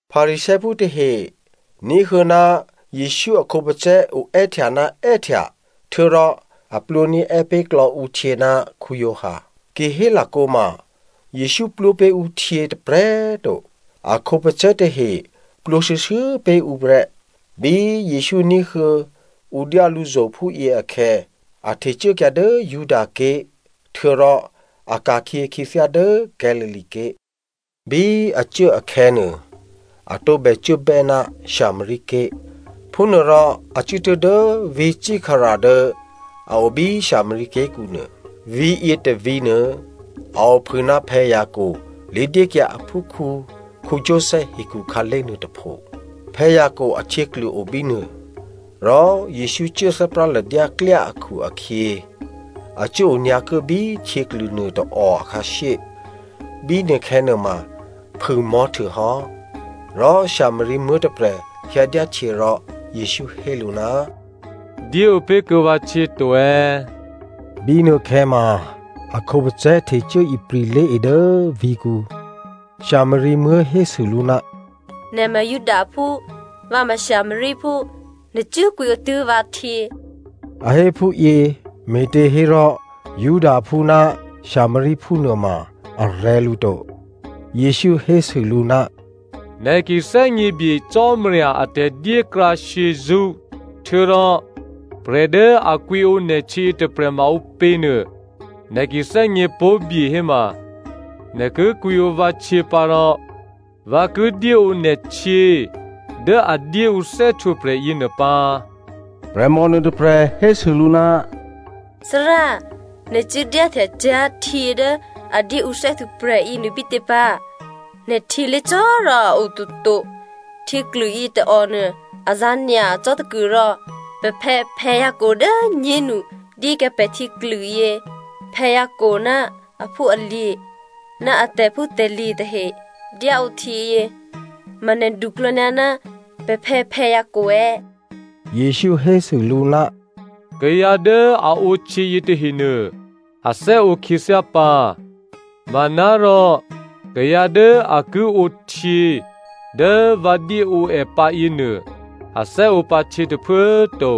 Pharisěophú tahe ní̤huô̌ ná Jesǔ a khǒpacè̤̌ oè́htya ná è́htya htuô̌rò a plwǒní̤è́ pé̤ klò̌ ǔ htyě ná Giovanni. Ki hélakǒ ma, Jesǔ plwǒ pé̤ ǔ htyě tôprè̤꤮ to, a khǒpacè̤̌ tahe plwǒ shuô̌shuô̌ pé̤ ǔ prè́. Bí Jesǔ ní̤huô̌ ǔ dyá lǔzo̤ phúyě akhè̌, a htecuốkyǎ dố Judaké̤ htuô̌rò a ka̤khyě khyěthyá dố Galilea ké̤. Bí a cuố akhè̌nuô, a tǒbè cuốbè́ ná Samaria ké̤. Phúnuôrò a cuốtuố̤ dố vǐ̤ Sykar dố a o bí Samaria ké̤kǔnuô. Vǐ̤ yětôvǐ̤nuô a ophû ná Jacob lé̤dyékyǎ aphúkhǔ Joseph hekhu khǎlé̤ nuôtôpho. Jacob ahtyěklû o bínuô. Rò Jesǔ cuố thè́práladyá klyá akhu-akhyě a cuố onyǎokuố bí htyěklû nuôtôò akhǎshyé. Bínuôkhè̌ nuôma phû꤮ mò̤́htuô hò́. Rò Samaria muố̤ tôprè̤ hyǎdyáhtyě, rò Jesǔ hé lǔ, “Dyéǒ pé̤kuô̌ vǎ htyě to꤮.” (Bínuôkhè̌ ma a khǒpacè̤̌ htecuố ipri̤ lé̤e dố vǐ̤kǔ.) Samaria muố̤ hésû lǔ, “Nè̤ ma Judaphú, vǎ ma Samariaphú, nè̤ cuố kwǐǒ tuố̤ vǎhtyě.” (A hé phúyě me̤těhérò Judaphú ná Samariaphú nuôma a rè̤̌ lǔ to.) Jesǔ hésû lǔ, “Nè̤ ki thè́gněbye Cò́marya a tè̤dyékrǎ shyězṳ́ htuô̌rò prè̤ dố a kwǐǒ nè̤htyě yětôprè̤ ma ǔpě nuô nè̤ ki thè́gně pó̤bye héma, nè̤ ki kwǐǒ vǎ htyě pǎ rò vǎ ki dyéǒ nè̤ htyě dố a dyé ǔ thè́htwǒprè̤ yěnuô pǎ.” Prè̤mò nuôtôprè̤ hésû lǔ, “Thárá꤮ nè̤ cuố dyáhtya cyá̤ htyě dố a dyé ǔ thè́htwǒprè̤ yěnuô bítě pǎ? Nè̤ htyělé̤cò̤̌ rò a o toto, htyěklû yětôònuô a zǎ̤ nyacò́ tôkuôrò. Pè̤phè̌ Jacob dố꤮ nyénu dyékyǎ pè̤ htyěklûyě. Jacob ná aphúalye̤ ná a tè̤phútè̤lye̤ tahe dyáǒ htyěyě. Ma nè̤ duklò̌nyǎ ná pè̤phè̌ Jacob è̌?” Jesǔ hésû lǔ, “Kayǎ dố a ǒhtyě yětahenuô, a thè́ǒ khyěthyá pǎ, manárò kayǎ dố a ki ǒhtyě dố vǎ dyéǒ è pǎ yěnuô, a thè́ǒ pǎ htyě tôphuố꤮ to.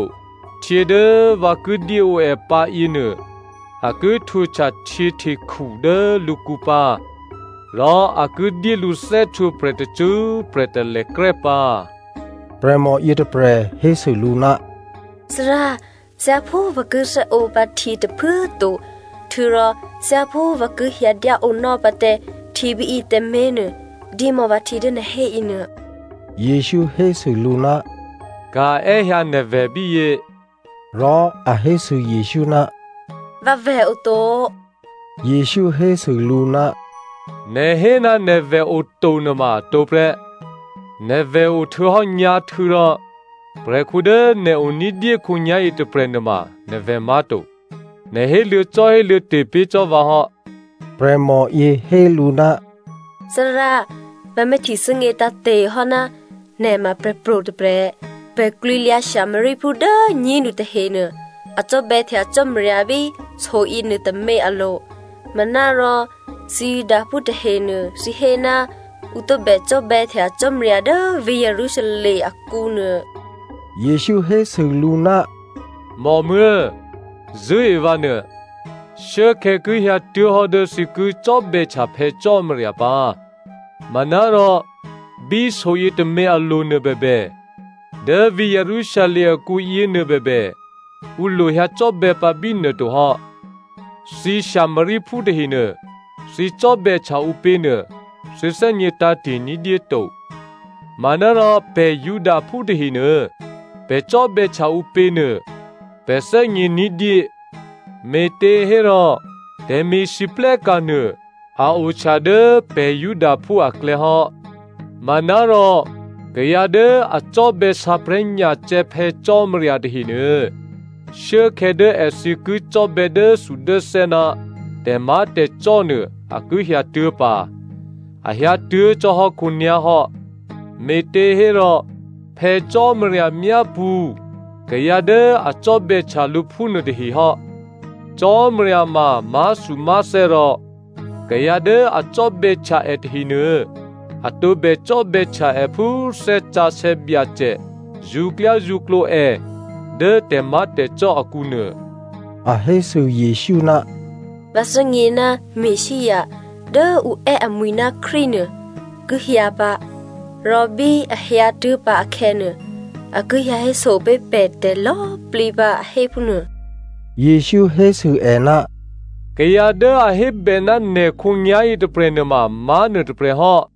Htyě dố vǎ ki dyéǒ è pǎ yěnuô, a ki htwǒhtya htyěhtekhu dố lǔkǔ pǎ. Rò a ki dyé lǔ thè́htwǒprè̤ tacṳ́prè̤ talèkrè́ pǎ.” Prè̤mò yětôprè̤ hésû lǔ, “Thárá꤮, thyáphú vǎ ki thè́ǒ pǎ htyě tôphuố꤮ to, htuô̌rò thyáphú vǎ ki hyǎ dyáǒnò́ pǎ tǎ htyě bíyě tǎmé̤nuô dyémò̌ vǎ htyě dố nè̤ hé yěnuô.” Jesǔ hésû lǔ, “Ka̤ è́hyǎ nè̤vè̤ bíyě.” Rò a hésû Jesǔ, “Vǎvè̤ oto.” Jesǔ hésû lǔ, “Nè̤ hé ná nè̤vè̤ oto nuôma atǒ prè́. Nè̤vè̤ ohtuô̌hò́ nyǎ̤htû̌ rò prè̤khǔ dố nè̤o ní̤dyé khǒnyá̤yě tôprè̤ nuôma nè̤ vè̤ má̤to. Nè̤ héluô̌cò́ héluô̌te̤ pé̤ cò́ vǎ hò́.” Prè̤mòyě hé lǔ, “Thárá꤮ vǎ myáhtye thè́gně tǎ̤te̤hò́ ná nè̤ ma prè̤pro̤ tôprè̤. Pè̤ klwǐlyǎ Samariaphú dố꤮ nyénu tahenuô, a cò́bè̌htya Cò́marya bí so yěnuôtômě alo̤. Manárò thǐ Judaphú tahenuô thǐ hé ná ǔ tǒbè cò́bè̌htya Cò́marya dố vǐ̤ Jerusalem akǔ nuô.” Jesǔ hésû lǔ, “Mòmuố̤꤮ zṳ̂́e vǎnuô, shuốkhè̌ ki hyǎtuố̤hò́ dố thǐ ki cò́bè̌htya Phè̌ Cò́marya pǎ. Manárò bí so yětômě alo̤ nuô bèbè, dố vǐ̤ Jerusalem akǔ yěnuô bèbè, ǔ lo hyǎcò́bè̌ pǎ bínuô tohò́. Thǐ Samariaphú tahenuô, thǐ cò́bè̌htya ǔpě nuô thǐ thè́gně tǎ̤te̤ ní̤dyé to. Manárò pè̤ Judaphú tahenuô, pè̤ cò́bè̌htya ǔpěnuô pè̤ thè́gně ní̤dyé, me̤těhérò tè̤me̤lwóhteka̤ nuô a ohtya dố pè̤ Judaphú aklè̌ hò́. Manárò kayǎ dố a cò́bè̌ sǎprè̤́nyacè̌ Phè̌ Cò́marya tahenuô, shuốkhè̌ dố èthǐ ki cò́bè̌ dốthudốthè́ ná tè̤má̤tè̤cò́ nuô, a ki hyǎtuố̤ pǎ. A hyǎtuố̤ cò́ hò́ khǒnyá̤ hò́. Me̤těhérò Phè̌ Cò́marya myápṳ̌ kayǎ dố a cò́bè̌htya lǔ phúnuô tahe hò́. Cò́marya ma má̤thumá̤thè́ rò kayǎ dố a cò́bè̌htya è tahenuô, a tǒbè cò́bè̌htya è phú Thè́ Sǎsè̌ Byacè zṳ̌klyázṳ̌klǒ è dố tè̤má̤tè̤cò́ akǔ nuô.” A hésû Jesǔ, “Vǎ thè́gně ná Messia (Dố ǔ è́ amwi̤ ná Krístu nuô) ki hyǎ pǎ, rò bí a hyǎtuố̤ pǎ akhè̌nuô, a ki hyǎhéso pé̤ pè̤ tè̤lò̌꤮ plǐ pǎ a hé phúnuô.” Jesǔ hésû è, “Kayǎ dố a hébè ná nè̤ khǒnyá̤yě tôprè̤ nuôma má̤ nuôtôprè̤ hò́.”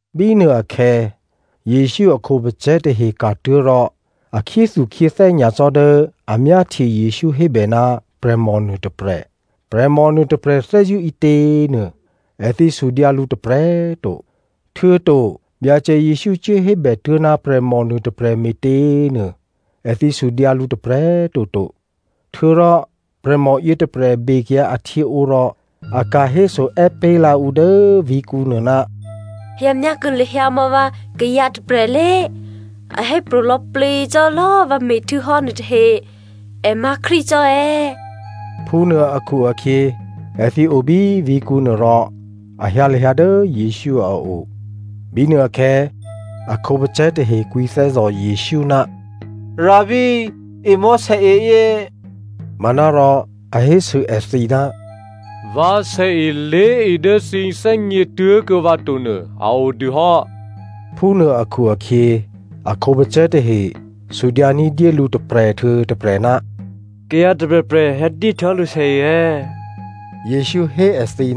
Bínuôakhè̌, Jesǔ a khǒpacè̤̌ tahe ka̤tuố̤ rò a khyéthukhyéthè́ nyacò́ dố a myáhtye Jesǔ hébè ná prè̤mò nuôtôprè̤. “Prè̤mò nuôtôprè̤ thè́zṳ̂́ ǐtě?” nuô, èthǐ sudyǎ lǔ tôprè̤꤮ to, htuô̌to “Byacè Jesǔ cuốhébè tuố̤ ná prè̤mò nuôtôprè̤ me̤tě?” nuô, èthǐ sudyǎ lǔ tôprè̤꤮ toto. Htuô̌rò prè̤mò yětôprè̤ bekyǎ ahtyěǒ rò a ka̤héso è́pé̤lǎ ǔ dố vǐ̤kǔnuô, “Hyǎ myákuô̌ lahyǎ mò̌ vǎ kayǎ tôprè̤ lé! A hépro̤ lò̌plǐ cò́ lò̌ vǎ me̤htuô̌hò́ nuôtahe. È má̤ Krístu cò́ è̌?” Phúnuô akhu-akhyě èthǐ o bí vǐ̤kǔ nuô rò a hyǎ lahyǎ dố Jesǔ a o. Bínuôakhè̌, a khǒpacè̤̌ tahe kwǐthè́zò̤ Jesǔ, “Rabbi꤮, emò̌ sèe yě꤮.” Manárò a hésû èthǐ, “Vǎ sèe lé̤e dố thǐ thè́gně tuố̤kuô̌ vǎ to nuô a o dû hò́.” Phúnuô akhu-akhyě a khǒpacè̤̌ tahe sudyǎ ní̤dyé lǔ tôprè̤ htuô̌ tôprè̤, “Kayǎ tôprè̤prè̤ hyǎdyé htuô̌hò́ lǔ sèe è̌?” Jesǔ hé èthǐ,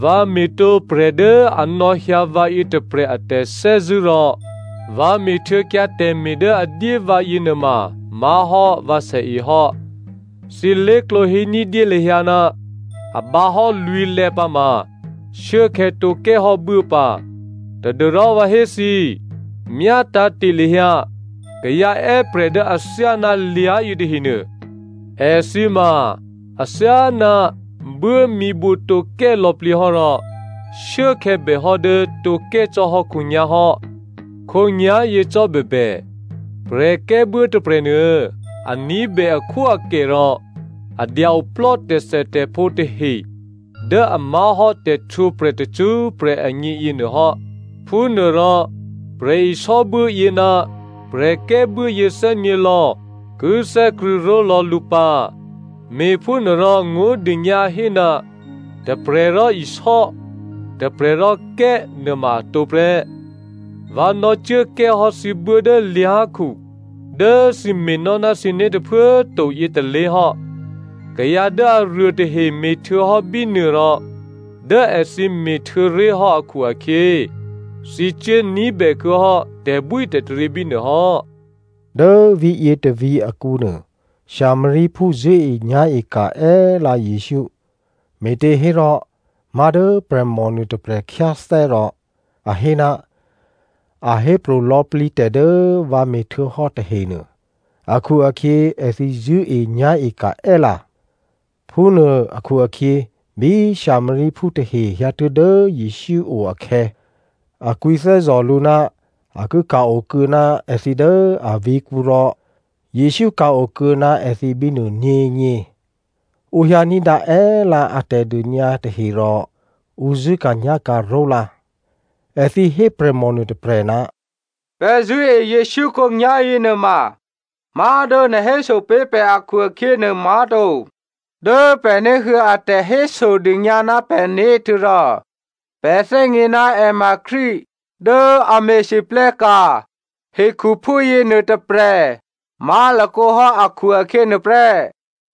“Vǎ me̤tǒ prè̤ dố a nò̌hyǎ vǎ yětôprè̤ a tè̤thè́zṳ̂́ rò vǎ me̤htuô̌kyǎ tè̤me̤ dố a dyé vǎ yěnuôma má̤hò́ vǎ sèe hò́. Thǐ lé̤klǒ hé ní̤dyé lahyǎ, ‘A bǎhò́ lwǐ̤lè̌ pǎ ma shuốkhè̌ tǒ kè́hò́ buố pǎ.’ Tadû́rò vǎ hé thǐ, myátǎ̤te̤ lahyǎ kayǎ è́prè̤ dố athyáná lyá̤ yětahenuô, èthǐ ma athyáná buố mǐbǔ tǒkè́ lò̌plǐ hò́ rò shuốkhè̌ bèhò́ dố tǒ kè́ cò́ hò́ khǒnyá̤hò́. Khǒnyá̤yě cò́ bèbè, prè̤kè́buố tôprè̤nuô a ní̤bè akhwóakè rò a dya-oplò́ tè̤thètè̤phǒ tahe dố a má̤hò́ tè̤htwǒprè̤ tacṳ́prè̤ agně yěnuô hò́. Phúnuôrò prè̤isò́buố yě ná prè̤kè́buố yě thè́nyě̤lò̌ ki thè́krṳ̂̌ ró̤lò̌ lǔ pǎ. Me̤phúnuôrò ngó̤dônyǎ hé, ‘Tôprè̤ rò isò́, tôprè̤ rò kè́’ nuôma atǒ prè́. Vǎ nò̌cuố kè́hò́ thǐ buố dố lyá̤khu dố thǐ me̤nò́ ná thǐné̤ tôphuố꤮ to yětôlé̤ hò́. Kayǎ dố aruô tahe me̤htuô̌hò́ bínuô rò dố èthǐ me̤htuô̌ré̤ hò́ akhu-akhyě, thǐ cuố ní̤bè kuô̌ hò́ tè̤bwítè̤taryě bínuôhò́.” Dố vǐ̤yě tôvǐ̤ akǔnuô Samariaphú zṳ̂́enyá̤e ka̤ è́lǎ Jesǔ, me̤těhérò má̤ dố prè̤mò nuôtôprè̤ khyáthè́ rò a hé, “A hépro̤ lò̌plǐ tè̤ dố vǎ me̤htuô̌hò́ tahenuô,” akhu-akhyě èthǐ zṳ̂́enyá̤e ka̤ è́lǎ. Phúnuô akhu-akhyě bí Samariaphú tahe hyǎtuố̤ dố Jesǔ o akhè̌, a kwǐthè́zò̤ lǔ ná a ki ka̤-okuô̌ ná èthǐ dố avǐ̤kǔ rò Jesǔ ka̤-okuô̌ ná èthǐ bínuô nyě̤nyě. Ǔ hyǎ ní̤dǎ è́lǎ a tè̤dônyǎ tahe rò ǔ zṳ̂́ka̤nyá̤ka̤ ró̤lǎ. Èthǐ hé prè̤mò nuôtôprè̤, “Pè̤ zṳ̂́e Jesǔ khǒnyá̤yě nuôma má̤dố nè̤ héso pé̤ pè̤ akhu-akhyě nuô má̤to. Dố pè̤ ní̤huô̌ a tè̤hésodônyǎ ná pè̤né̤ htuô̌rò pè̤ thè́gně ná è ma Krístu dố a me̤lwóhteka̤ hekhuphú yěnuô tôprè̤ má̤lakǒ hò́, akhu-akhyě nuôprè́.”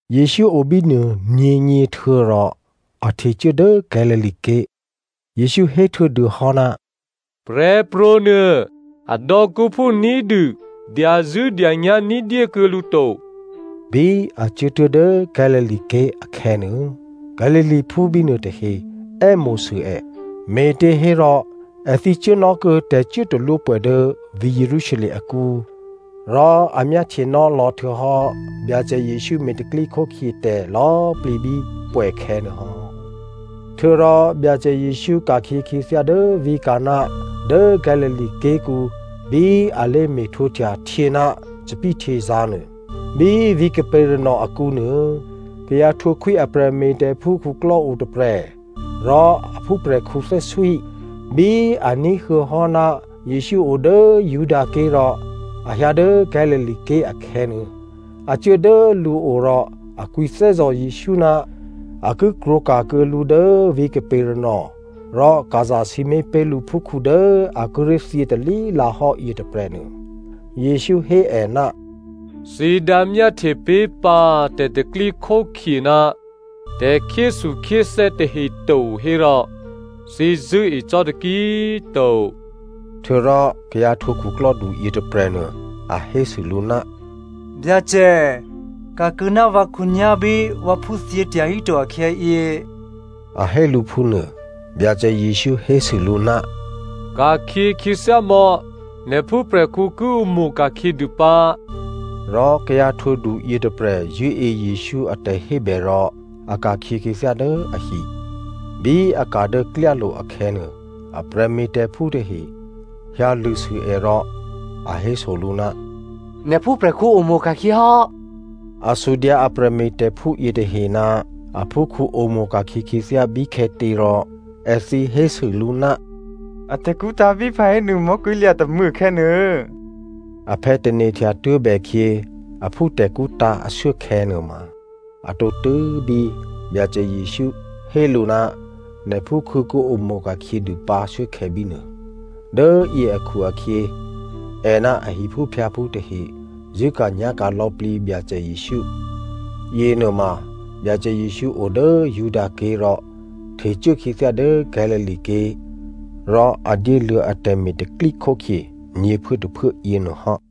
Jesǔ o bínuô nyě̤nyě htuô̌rò a htecuố dố Galilea ké̤. Jesǔ héhtuô̌ dû hò́, “Prè̤pro̤ nuô adò̌kǔphú ní̤dû dyazṳ̂́dyanyá̤ ní̤dyékuô̌ lǔ to.” Bí a cuốtuố̤ dố Galilea ké̤ akhè̌nuô, Galileaphú bínuô tahe è́mo̤sû è, me̤těhérò èthǐ cuốnò́kuô̌ tè̤cuốtalwópwè̌ dố vǐ̤ Jerusalem akǔ rò a myáhtyenò́ lò̌ htuô̌hò́ Byacè Jesǔ me̤ tè̤pro̤tè̤prya̤ tè̤lò̌꤮ plǐ bí pwè̌khè̌ nuôhò́. Htuô̌rò, Byacè Jesǔ ka̤khyě khyěthyá dố vǐ̤ Canan dố Galilea ké̤kǔ bí alé̤ me̤htwǒhtya htyě ná thòbǐthèhtyězǎ̤ nuô. Bí vǐ̤ Capernaum akǔ nuô, kayǎ htwǒ khwí a prè̤me̤tè̤phú khuklò́ otôprè̤ rò a phúprè̤khǔ thè́swí. Bí a ní̤huô̌ hò́ ná Jesǔ o dố Judaké̤ rò a hyǎ dố Galilea ké̤ akhè̌nuô, a cuố dố lǔo rò a kwǐthè́zò̤ Jesǔ ná a ki krwǒka̤kuô̌ lǔ dố vǐ̤ Capernaum rò ka̤ zasǐmé̤ pé̤ lǔ phúkhǔ dố a kíré̤ thyětalí lǎhò́ yětôprè̤nuô. Jesǔ hé è, “Thǐ dǎmyáhtye pé̤pǎ tè̤pro̤tè̤prya̤ ná tè̤khyéthukhyéthè́ tahe to hérò, thǐ zṳ̂́e cò́ taki꤮ to.” Htuô̌rò kayǎ htwǒ khuklò́du yětôprè̤nuô a hésû lǔ, “Byacè꤮ ka̤ kuô̌ná vǎ khǒnyá̤ bí vǎphú thyě tyahíto akhè̌yě,” a hé lǔ phúnuô. Byacè Jesǔ hésû lǔ, “Ka̤khyě khyěthyá mò̌. Nè̤ phúprè̤khǔ ki omo̤ ka̤khyě dû pǎ.” Rò kayǎ htwǒ du yětôprè̤ zṳ̂́e Jesǔ a tè̤hébè rò a ka̤khyě khyěthyá dố ahi. Bí a ka̤ dố klyálo̤ akhè̌nuô, a prè̤me̤tè̤phú tahe hyǎ lṳ̂sû è rò a héso lǔ, “Nè̤ phúprè̤khǔ omo̤ ka̤khyě hò́.” A sudyǎ a prè̤me̤tè̤phú yětahe ná aphúkhǔ omo̤ ka̤khyě khyěthyá bíkhè̌tě rò èthǐ hésû lǔ, “A tè̤kṳ́ tǎ̤ bí pahénu mò̤́kwí̤lya̤ tômû̌ akhè̌nuô.” Aphè̌ tane̤htya tuố̤bèkhyě aphú tè̤kṳ́ tǎ̤ ashuốkhè̌ nuôma, a tǒtû́ bí Byacè Jesǔ hé lǔ, “Nè̤ phúkhǔ ki omo̤ ka̤khyě dû pǎ shuốkhè̌ bínuô.” Dố yě akhu-akhyě è ná a hiphúphyǎphú tahe zṳ̂́ka̤nyá̤ka̤ lò̌plǐ Byacè Jesǔ. Yěnuôma Byacè Jesǔ o dố Judaké̤ rò htecuố khyěthyá dố Galilea ké̤ rò a dyéluô̌ atè̤me̤ tè̤pro̤tè̤prya̤ nyě̤phuốtôphuố yěnuô hò́.